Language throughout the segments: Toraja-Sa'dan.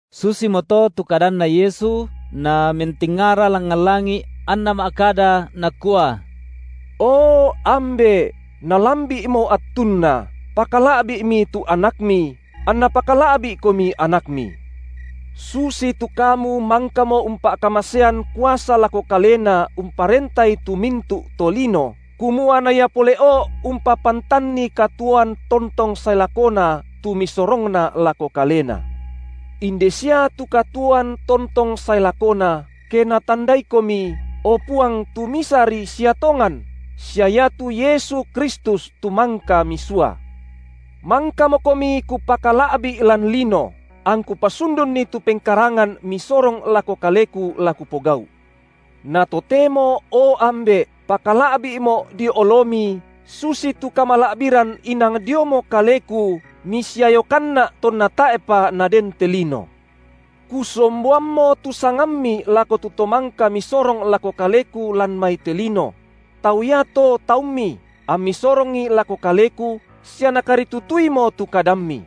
Susimoto tu kadanNa Yesu, Namentingara langngan langi’ anNa ma’kada, Nakua: O Ambe’, nalambi’mo attunna, pakala’bi’mi tu AnakMi, anNa pakala’bi’komi AnakMi. Susitu Kamu mangkamo umpa’kamasean kuasa lako Kalena umparentai tu mintu’ tolino, kumua na Ia pole’o umpapantanni katuoan tontong sae lakona tu Misorongna lako Kalena. Inde sia tu katuoan tontong sae lakona, ke natandaiKomi, o Puang tu misari sia tongan, sia iatu Yesu Kristus tu mangka Misua. MangkamoKomi Kupakala’bi’ lan lino angKu pasundunni tu pengkarangan Misorong lako Kaleku la Kupogau’. Na totemo o Ambe’, pakala’bi’Mo’ dio oloMi susitu kamala’biran inang diomo kaleKu MisiayokanNa’ tonna tae’pa naden te lino. Kusomboammo tu sangamMi lako tu to mangka Misorong lako Kaleku lan mai te lino; tau iato taumMi, amMi sorongi lako Kaleku, sia nakaritutuimo tu kadamMi.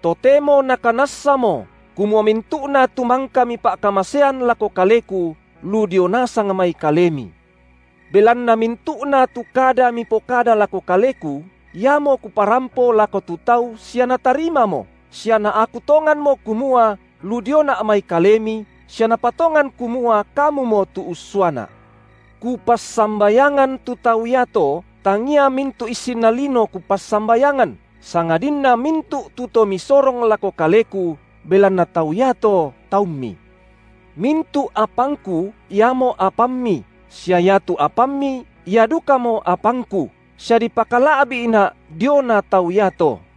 Totemo nakanassamo, kumua mintu’na tu mangka Mipa’kamasean lako Kaleku, lu dio nasang mai Kalemi. Belanna mintu’na tu kada Mipokada lako Kaleku, iamo Kuparampo lako tu tau sia natarimamo, sia naaku tonganmo kumua lu dioNa’ mai Kalemi, sia napatongan kumua Kamumo tu ussuaNa’. Kupassambayangan tu tau iato, tangia mintu’ issinna lino Kupassambayangan, sangadinna mintu’ tu to Misorong lako Kaleku, belanna tau iato taumMi. Mintu’ apangKu iamo apamMi, sia iatu apamMi ia dukamo apangKu, sia dipakala’bi’Na’ diona tau iato.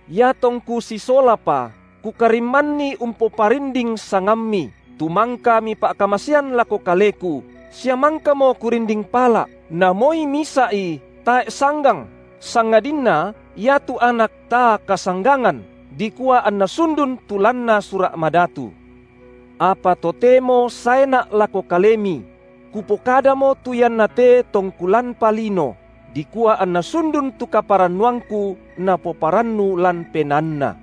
IatongKu sisolapa, Kukarimmanni umpoparinding sangamMi, tu mangka Mipa’kamasean lako Kaleku, sia mangkamo Kurinding pala’, na moi misa’i tae’ sanggang sangadinna iatu anak taa kasanggangan, dikua anna sundun tu lanna Sura’ Madatu. Apa totemo saeNa’ lako Kalemi; Kupokadamo tu iannate tongKu lanpa lino, dikua anna sundun tu kaparannuangKu napoparannu lan penaanna.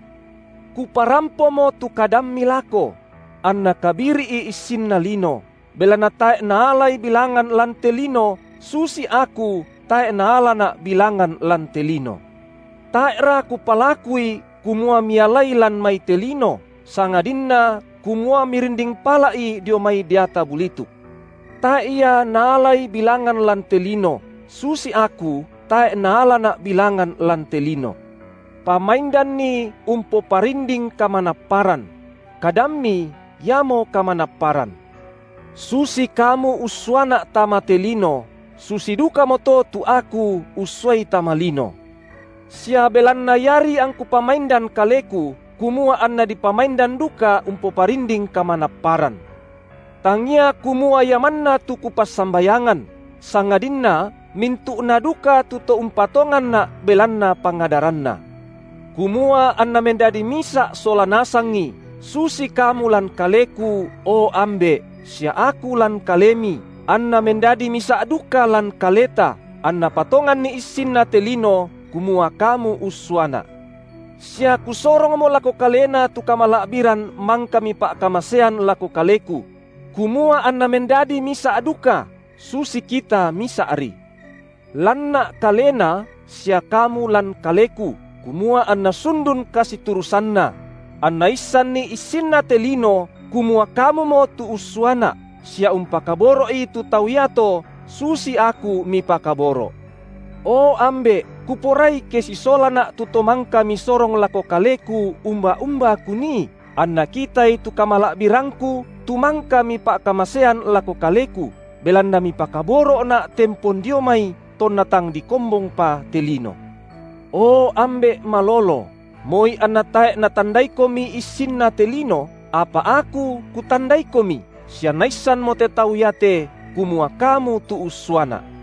Kuparampomo tu kadamMi lako; anna kabiri’i issinna lino, belanna tae’ naalai bilangan lan te lino, susi Aku tae’ naalaNa’ bilangan lan te lino. Tae’ra Kupalakui kumua Mialai lan mai te lino, sangadinna kumua Mirinding pala’i dio mai deata bulituk. Tae’ ia naalai bilangan lan te lino, susi Aku tae’ naalaNa’ bilangan lan te lino. Pamaindanni umpoparinding kamanapparan; Kadammi iamo kamanapparan. Susi Kamu ussuaNa’ tama te lino, susi dukamoto tu Aku ussuai tama lino. Sia belanna iari angKu pamaindan Kaleku, kumua anna dipamaindan duka umpoparinding kamanapparan. Tangia kumua ia manna tu Kupassambayangan, sangadinna mintu’na duka tu to umpatonganNa’ belanna pangadaranna; kumua anna mendadi misa’ sola nasangi, susi Kamu lan Kaleku, o Ambe’, sia Aku lan Kalemi, anna mendadi misa’ duka lan Kaleta, anna patonganni issinna te lino, kumua Kamu ussuaNa’. Sia Kusorongmo lako kalena tu kamala’biran mangka Mipa’kamasean lako Kaleku: kumua anna mendadi misa’ duka, susi Kita misa’ri. LanNa’ kalena sia Kamu lan Kaleku, kumua anna sundun kasiturusanna; anna issanni issinna te lino kumua kamumo tu ussuaNa’, sia umpakaboro’i tu tau iato susi Aku Mipakaboro’. O Ambe’, Kuporai ke sisolaNa’ tu to mangka Misorong lako Kaleku umba-umba Kunii, anna kitai tu kamala’birangKu tu mangka Mipa’kamasean lako Kaleku, belanna Mipakaboro’Na’ tempon dio mai tonna tang dikombongpa te lino. O Ambe’ malolo, moi anna tae’ natandaiKomi issinna te lino, apa Aku KutandaiKomi, sia naissanmo te tau iate kumua Kamu tu ussuaNa’.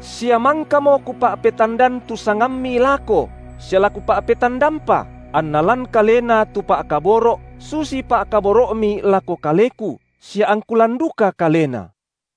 Sia mangkamo Kupa’petandan tu sangamMi lako sia la Kupa’petandampa, anna lan kalena tu pa’kaboro’ susi pa’kaboro’Mi lako Kaleku, sia angKu lan duka kalena.